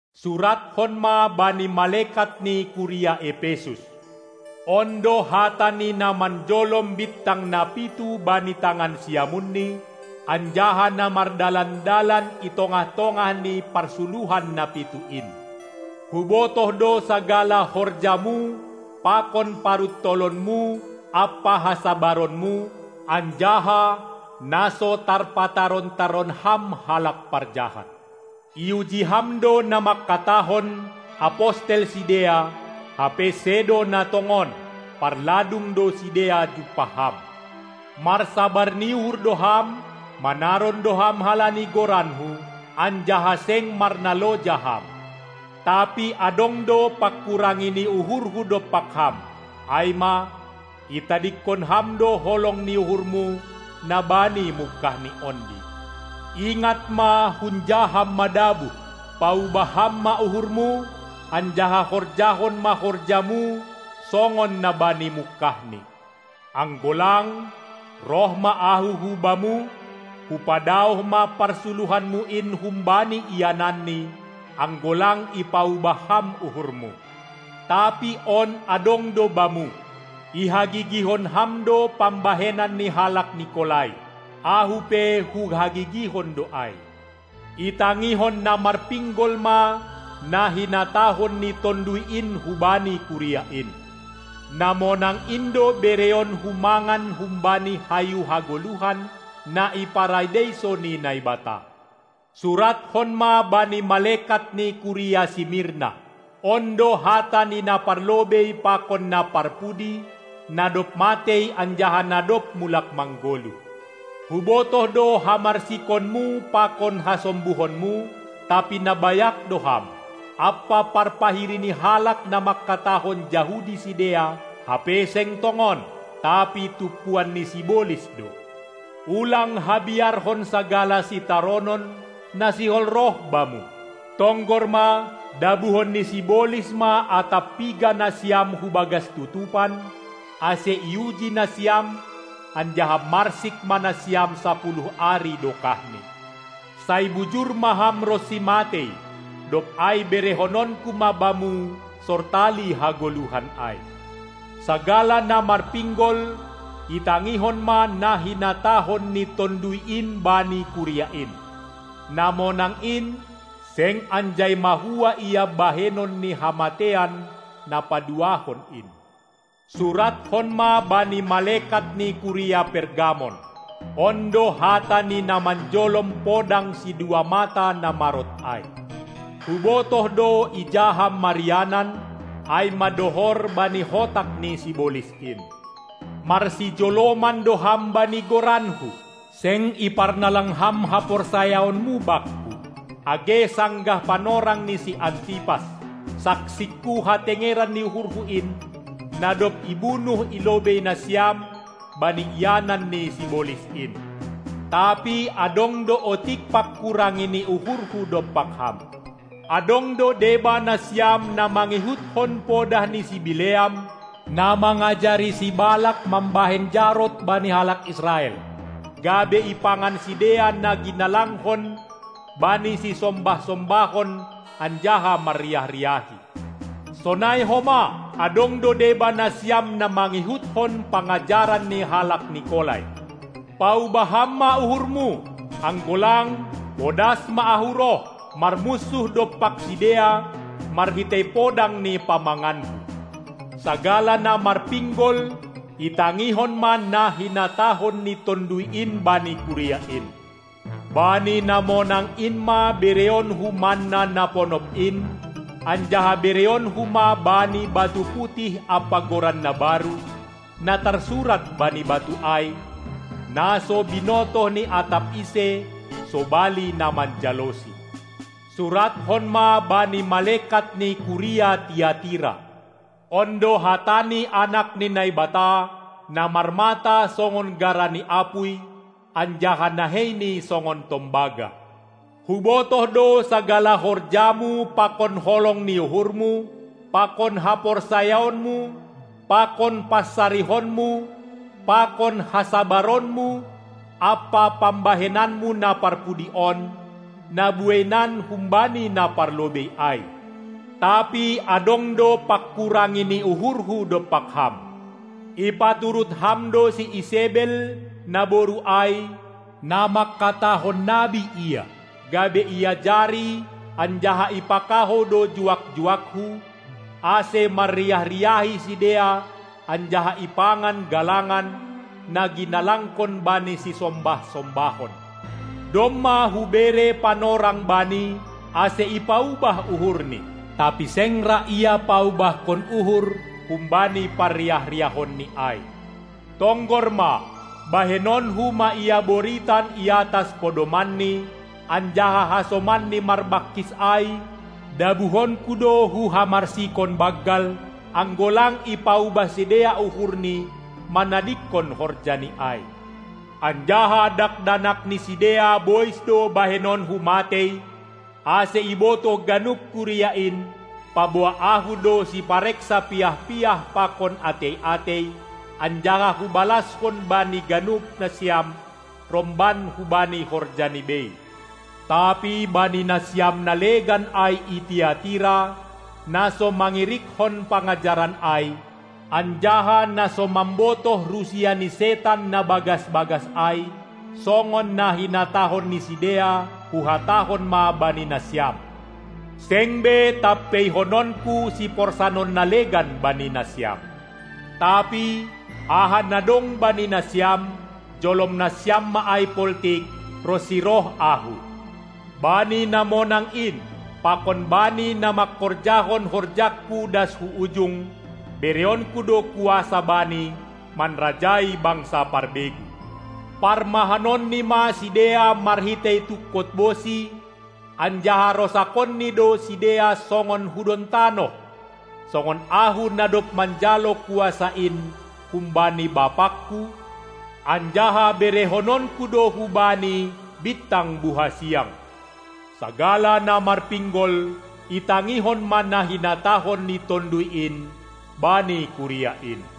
Surathon ma bani malekat ni kuria Epesus: On do hata ni na manjolom bintang na pitu bani tangan siamunni, anjaha na mardalan-dalan i tongah-tongah ni parsuluhan na pitu in: Hubotoh do sagala horjamu pakon paruntolonmu ampa hasabaronmu, anjaha na so tarpataron-taron ham halak parjahat. Iuji ham do na mangkatahon, apostel sidea, hape sedo na tongon; parladung do sidea jumpah ham. Marsabar ni uhur do ham, manaron do ham halani goranKu, anjaha seng marnaloja ham. Tapi adong do panghurangi ni uhurhu dompak ham, ai ma: Itadingkon ham do holong ni uhurmu na bani mungkahni ondi. Ingat ma, hunja ham madabuh, paubah ham ma uhurmu, anjaha horjahon ma horjamu songon na bani mungkahni! Anggo lang, roh ma Ahu hubamu, hupadaoh ma parsuluhanmu in humbani iananni, anggo lang ipaubah ham uhurmu. Tapi on adong do bamu: Ihagigihon ham do pambahenan ni halak Nikolai. Ahu pe huhagigihon do ai. Itangihon na marpinggol ma na hinatahon ni Tonduy in hubani kuria in: Na monang in do bereonku mangan humbani hayu hagoluhan, na i Paradeiso ni Naibata. Surathon ma bani malekat ni kuria Simirna: On do hata ni na Parlobei pakon na Parpudi, na dob matei anjaha na dob mulak manggoluh. Hubotoh do hamarsikonmu pakon hasombuhonmu, tapi na bayak do ham, ampa parpahiri ni halak na manghatahon Jahudi sidea, hape seng tongon, tapi tumpuan ni sibolis do. Ulang habiarhon sagala sitaronon, na sihol roh bamu. Tonggor ma, dabuhon ni sibolis ma atap piga nasiam hubagas tutupan, ase iuji nasiam anjaha marsik ma nasiam sapuluh ari dokahni. Sai bujur ma ham ronsi matei, dob ai berehononku ma bamu sortali hagoluhan ai! Sagala na marpinggol itangihon ma na hinatahon ni Tonduy in bani kuria in. Na monang in seng anjai mahua ia bahenon ni hamateian na paduahon in. Surathon ma bani malekat ni kuria Pergamon: On do hata ni na manjolom podang sidua mata na marot ai. Hubotoh do, ija ham marianan, ai ma dohor bani hotak ni sibolis in. Marsijoloman do ham bani goranKu, seng iparnalang ham haporsayaonmu Bakku, age sanggah panorang ni si Antipas, saksikku hatengeran ni uhurhu in, na dob ibunuh i lobei nasiam bani ianan ni sibolis in. Tapi adong do otik panghurangi ni uhurhu dompak ham: Adong do deba nasiam na mangihutkon podah ni si Bileam, na mangajari si Balas mambahen jarot bani halak Israel, gabe ipangan sidea na ginalangkon bani sisombah-sombahon anjaha marriah-riahi. Sonai homa, adong do deba nasiam na mangihuthon pangajaran ni halak Nikolai. Paubah ham ma uhurmu! Anggo lang, podas ma Ahu roh, marmunsuh dompak sidea marhitei podang ni pamanganKu. Sagala na marpinggol itangihon ma na hinatahon ni Tonduy in bani kuria in. Bani na monang in ma bereonku manna na ponop in, anjaha bereonku ma bani batu putih ampa goran na baru, na tarsurat bani batu ai, na so binotoh ni atap ise sobali na manjalosi. Surathon ma bani malekat ni kuria Tiatira: On do hata ni Anak ni Naibata, na marmata songon gara ni apuy anjaha naheini songon tombaga. Hubotoh do sagala horjamu pakon holong ni uhurmu pakon haporsayaonmu pakon pansarihonmu pakon hasabaronmu ampa pambahenanmu na parpudi on, na bueinan humbani na parlobei ai. Tapi adong do panghurangi ni uhurhu dompak ham: Ipaturut ham do si Isebel, naboru ai, na mangkatahon nabi ia, gabe iajari anjaha ipakahou do juak-juakKu, ase marriah-riahi sidea anjaha ipangan galangan, na ginalangkon bani sisombah-sombahon. Domma hubere panorang bani, ase ipaubah uhurni, tapi seng ra ia paubahkon uhur humbani parriah-riahonni ai. Tonggor ma, bahenonku ma ia boritan iatas podomanni, anjaha hasomanni marbangkis ai dabuhonku do hu hamarsikon banggal, anggo lang ipaubah sidea uhurni manadingkon horjani ai. Anjaha dakdanak ni sidea bois do bahenonku matei, ase ibotoh ganup kuria in, paboa Ahu do sipareksa piah-piah pakon atei-atei, anjaha hubalashon bani ganup nasiam romban hubani horjani bei. Tapi bani nasiam na legan ai i Tiatira, na so mangirikhon pangajaran ai, anjaha na so mambotoh rusia ni setan na bagas-bagas ai, songon na hinatahon ni sidea, huhatahon ma bani nasiam: Seng be tampeihononku siporsanon na legan bani nasiam. Tapi, aha na dong bani nasiam, jolom nasiam ma ai poltik, ronsi roh Ahu. Bani na monang in pakon bani na mangkorjahon horjangKu das hu ujung, bereonKu do kuasa bani, manrajai bangsa parbegu. Parmahanonni ma sidea marhitei tungkot bosi anjaha rosakonni do sidea songon hudon tanoh, songon Ahu na dob manjalo kuasa in humbani BapangKu, anjaha berehononku do hubani bintang buhasiang. Sagala na marpinggol itangihon ma na hinatahon ni Tonduy in bani kuria in.